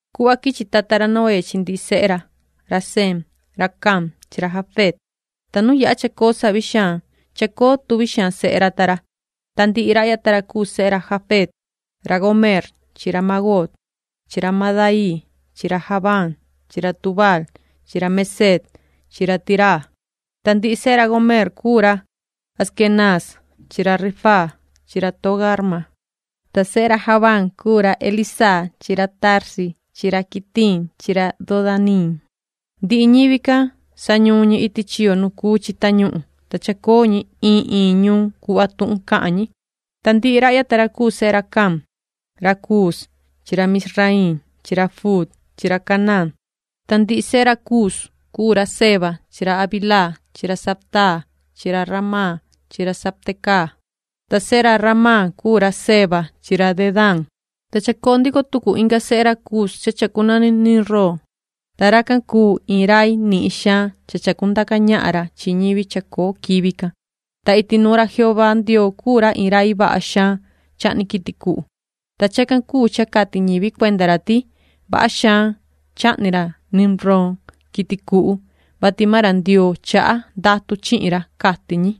Cuhva quichi tata ra Noé chi ndihi sehe ra, ra Sem ra Cam chi ra Jafet, ta nu yaha chacoo savi xaan, chacoo tuvi xaan sehe ra ta ra. Ta ndihi rahya ta ra cuu sehe ra Jafet ra Gomeer chi ra Magoog chi ra Madaii chi ra Javaan chi ra Tubaal chi ra Meseec chi ra Tiraa. Ta ndihi sehe ra Gomeer cuu ra Askenaaz chi ra Rifaat chi ra Togarma. Ta sehe ra Javaan cuu ra Elisaa chi ra Tarsis chi ra Quitiim chi ra Dodaniim. Ndihi ñivi can, sañuun ñi iti chiyo nu cuu chi tañuhun, ta chacoo ñi iin iin ñuun cuhva tuhun cahan ñi. Ta ndihi rahya ta ra cuu sehe ra Cam: ra Cuus chi ra Misraiim chi ra Fuut chi ra Canaán. Ta ndihi sehe ra Cuus cuu ra Seba chi ra Havilaa chi ra Sabtaa chi ra Ramá chi ra Sabtecaa. Ta sehe ra Ramá cuu ra Seba chi ra Dedán. Ta chacoo ndico tucu inga sehe ra Cus cha chacunani Nimrod, ta racan cuu iin rai nihin xaan cha chacundaca ñahan ra chi ñivi chacoo quivi can. Ta iti nuun ra Jehová Ndioo cuu ra iin rai vaha xaan chahni quiti cuhu, ta chacan cuu cha cati ñivi cuenda ra ti: “Vaha xaan chahni ra Nimrod quiti cuhu, vati maan ra Ndioo chaha ndatu chihin ra”, cati ñi.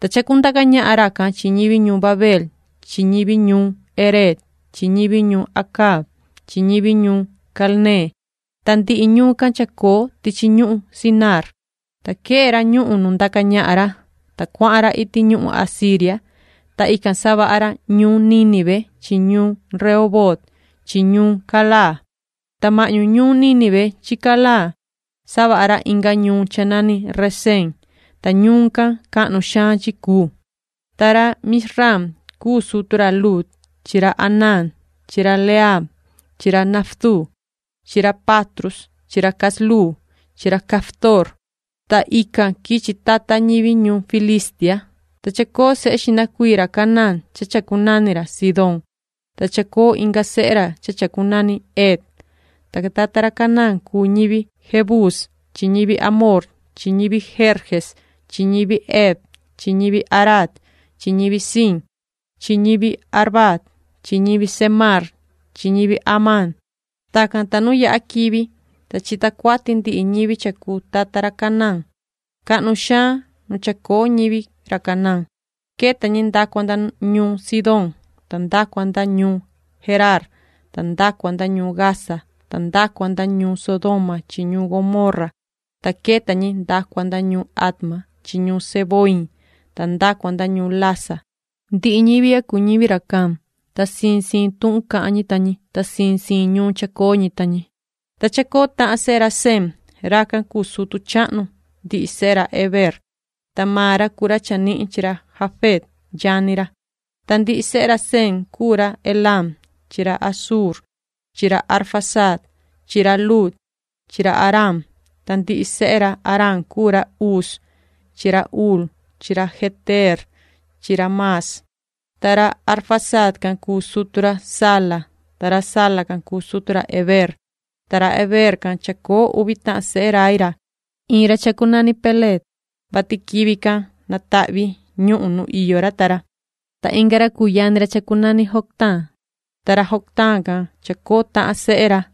Ta chacundaca ñahan racan chi ñivi ñuun Babeel chi ñivi ñuun Ereec chi ñivi ñuun Acaad chi ñivi ñuun Calnee, ta ndihi ñuun can chacoo tichi ñuhun Sinaar. Ta quee ra ñuhun nu ndaca ñahan ra, ta cuahan ra iti ñuhun Asiria, ta ican savaha ra ñuun Nínive chi ñuun Rehoboot chi ñuun Calaa, ta mahñu ñuun Nínive chi Calaa savaha ra inga ñuun cha nani Reseen, ta ñuun can cahnu xaan chi cuu. Ta ra Mizraim cuu sutu ra Ludim, ra Anamim, ra Lehabim, ra Naftuhim, chi ra Patrusim chi ra Casluhim chi ra Caftorim. Ta ican quichi tata ñivi ñuhun Filistia. Ta chacoo sehe xihna cuii ra Canaán cha chacunani ra Sidón, ta chacoo inga sehe ra cha chacunani Het. Ta tata ra Canaán cuu ñivi Jebús chi ñivi amorreo chi ñivi Gerges chi ñivi Hev chi ñivi Araac chi ñivi Siin chi ñivi Arvaad chi ñivi Zemaar chi ñivi Hamaat. Tacan, ta nu yaha quivi, ta chita cuati ndihi ñivi cha cuu tata ra Canaán. Cahnu xaan nu chacoo ñivi ra Canaán. Queta ñi nda cua nda ñuun Sidón ta nda cua nda ñuun Geraar ta nda cua nda ñuun Gaza ta nda cua nda ñuun Sodoma chi ñuun Gomorra, ta queta ñi nda cua nda ñuun Adma chi ñuun Zeboiim ta nda cua nda ñuun Lasa. Ndihi ñivi ya cuu ñivi ra Cam, ta siin siin tuhun cahan ñi ta ñi, ta siin siin ñuun chacoo ñi ta ñi. Ta chacoo tahan sehe ra Sem. Racan cuu sutu chahnu ndihi sehe ra Heber, ta maan ra cuu ra chanihin chi ra Jafet yani ra. Ta ndihi sehe ra Sem cuu ra Elam chi ra Asur chi ra Arfaxad chi ra Lud chi ra Aram. Ta ndihi sehe ra Aram cuu ra Uz chi ra Hul chi ra Geter chi ra Mas. Ta ra Arfaxad can cuu sutu ra Sala, ta ra Sala can cuu sutu ra Heber. Ta ra Heber can chacoo uvi tahan sehe rai ra. Iin ra chacunani Peleg, vati quivi can natahvi ñuhun nu iyo ra ta ra, ta inga ra cuu yani ra chacunani Joctaan. Ta ra Joctaan can chacoo tahan sehe ra,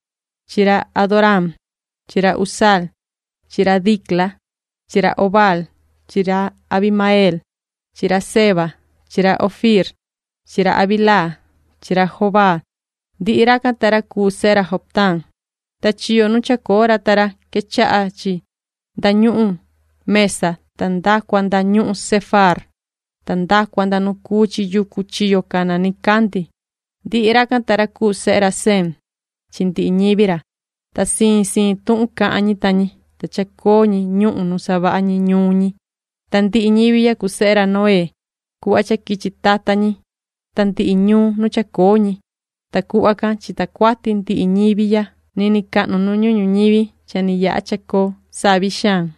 chi ra Adoraam chi ra Uzaal chi ra Dicla chi ra Obaal chi ra Abimaeel chi ra Seba chi ra Ofiir chi ra Havilaa chi ra Jobaab. Ndihi racan ta ra cuu sehe ra Joctaan. Ta chiyo nu chacoo ra ta ra quechaha chi nda ñuhun Mesa ta nda cua nda ñuhun Sefaar ta nda cua nda nu cuu chi yucu chiyo cana nicandi. Ndihi racan ta ra cuu sehe ra Sem chi ndihi ñivi ra, ta siin siin tuhun cahan ñi ta ñi, ta chacoo ñi ñuhun nu savaha ñi ñuun ñi. Ta ndihi ñivi ya cuu sehe ra Noé cuhva cha quichi tata ñi ta ndihi ñuun nu chacoo ñi, ta cuhva can chita cuati ndihi ñivi ya niniin cahnu nu ñuhun ñuñivi cha ni yaha cha chacoo savi xaan.